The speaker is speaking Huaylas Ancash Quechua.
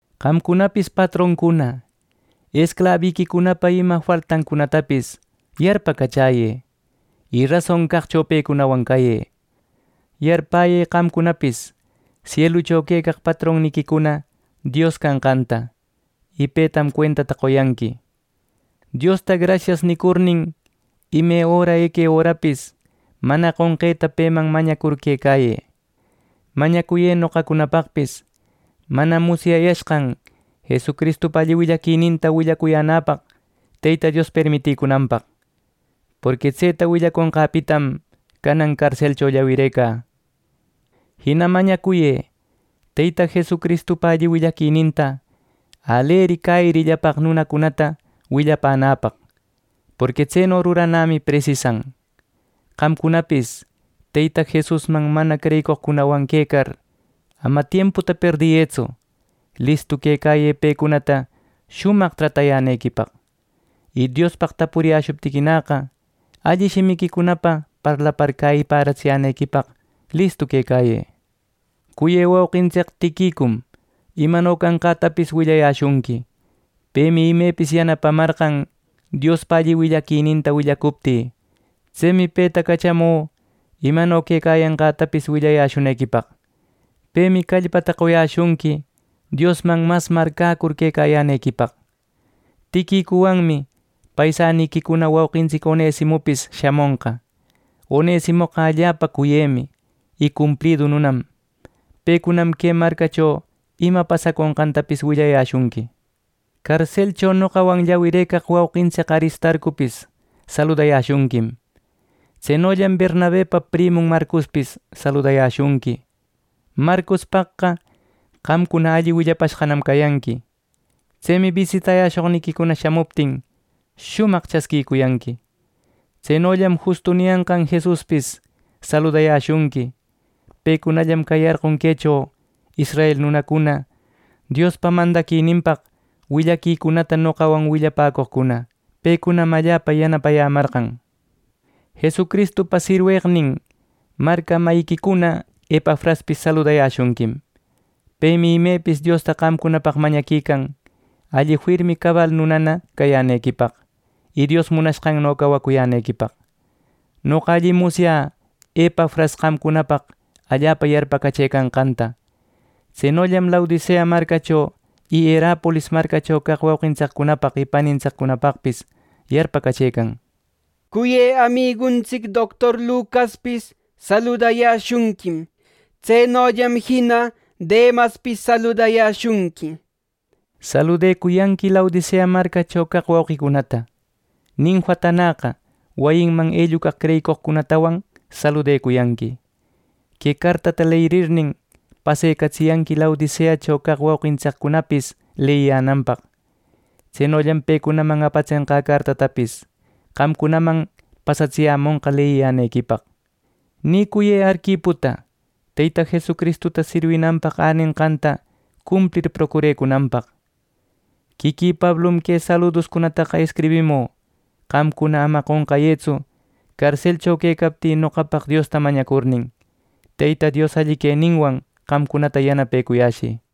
Qamcunapis patroncuna, esclabiquicunapa ima faltancunatapis yarpacachäyë, y rason caqcho pecunawan cayë. Yarpäyë qamcunapis sielucho quecaq patronniquicuna Dios canqanta, y petam cuentata qoyanqui. Diosta “Grasias” nicurnin, ime öra eque örapis mana qonqeta peman mañacur quecayë. Mañacuyë noqacunapaqpis mana musyayashqan Jesucristupa alli willaquininta willacuyänäpaq Teyta Dios permiticunanpaq. Porqui tseta willaconqäpitam, canan carselcho llawirecä. Jina mañacuyë Teyta Jesucristupa alli willaquininta aleri cäyirillapaq nunacunata willapänäpaq, porqui tseno ruranämi presisan. Qamcunapis Teyta Jesusman mana creyicoqcunawan quecar ama tiemputa perdiyëtsu, listu quecayë pecunata shumaq tratayänequipaq. Y Diospaq tapuriyäshuptiquinäqa, alli shimiquicunapa parlapar cäyipäratsiyänequipaq listu quecayë. Cuyë wauqintsic Tiquicum imano canqätapis willayäshunqui. Pemi imepis yanapamarqan, Diospa willaquininta willacuptï. Tsemi peta cachamü imano quecayanqätapis willayäshunequipaq. Pemi callpata qoyäshunqui, Diosman mas marcäcur quecayänequipaq. Tiquicuwanmi paisaniquicuna wauqintsic Onesimopis shamonqa. Onesimoqa allapa cuyemi y cumplidu nunam. Pecunam que marcacho ima pasaconqantapis willayäshunqui. Carselcho noqawan llawirëcaq wauqintsic Aristarcopis saludayäshunquim. Tsenollam Bernabepa primun Marcospis saludayäshunqui. Marcospaqqa qamcuna alli willapashqanam cayanqui. Tsemi bisitayäshoqniquicuna shamuptin, shumaq chasquiyanqui. Tsenollam Justo niyanqan Jesuspis saludayäshunqui. Pecunallam cayarqon quecho israel nunacuna Diospa mandaquininpaq willaquicunata noqawan willapäcoqcuna. Pecunam allapa yanapayämarqan. Jesucristupa sirweqnin marca mayiquicuna Epafraspis saludayäshunquim. Pemi imepis Diosta qamcunapaq mañaquican alli firmi cabal nunana cayänequipaq, y Dios munanqanno cawacuyänequipaq. Noqa allim musyä Epafras qamcunapaq allapa yarpacachëcanqanta. Tsenollam Laodicea marcacho y Hierapolis marcacho caq wauqintsiccunapaq y panintsiccunapaqpis yarpacachëcan. Cuyë amiguntsic doctor Lucaspis saludayäshunquim; tsenollam jina Demaspis saludayäshunqui. Saludecuyanqui Laodicea marcacho caq wauqicunata. Ninfatanäqa wayinman ellucaq creyicoqcunatawan saludecuyanqui. Que cartata leyirirnin, pasecatsiyanqui Laodiceacho caq wauqintsiccunapis leyiyänanpaq. Tsenollam pecunaman apatsenqä cartatapis, qamcunaman pasatsiyämonqa leyiyänequipaq. Nicuyë Arquiputa Teyta Jesucristuta sirwinanpaq änenqanta cumplir procurecunanpaq. Quiquï Pablum que saluducunataqa escribimü. Qamcuna ama qonqayëtsu carselcho quecaptï noqapaq Diosta mañacurnin. Teyta Dios alli queninwan qamcunata yanapecuyäshï.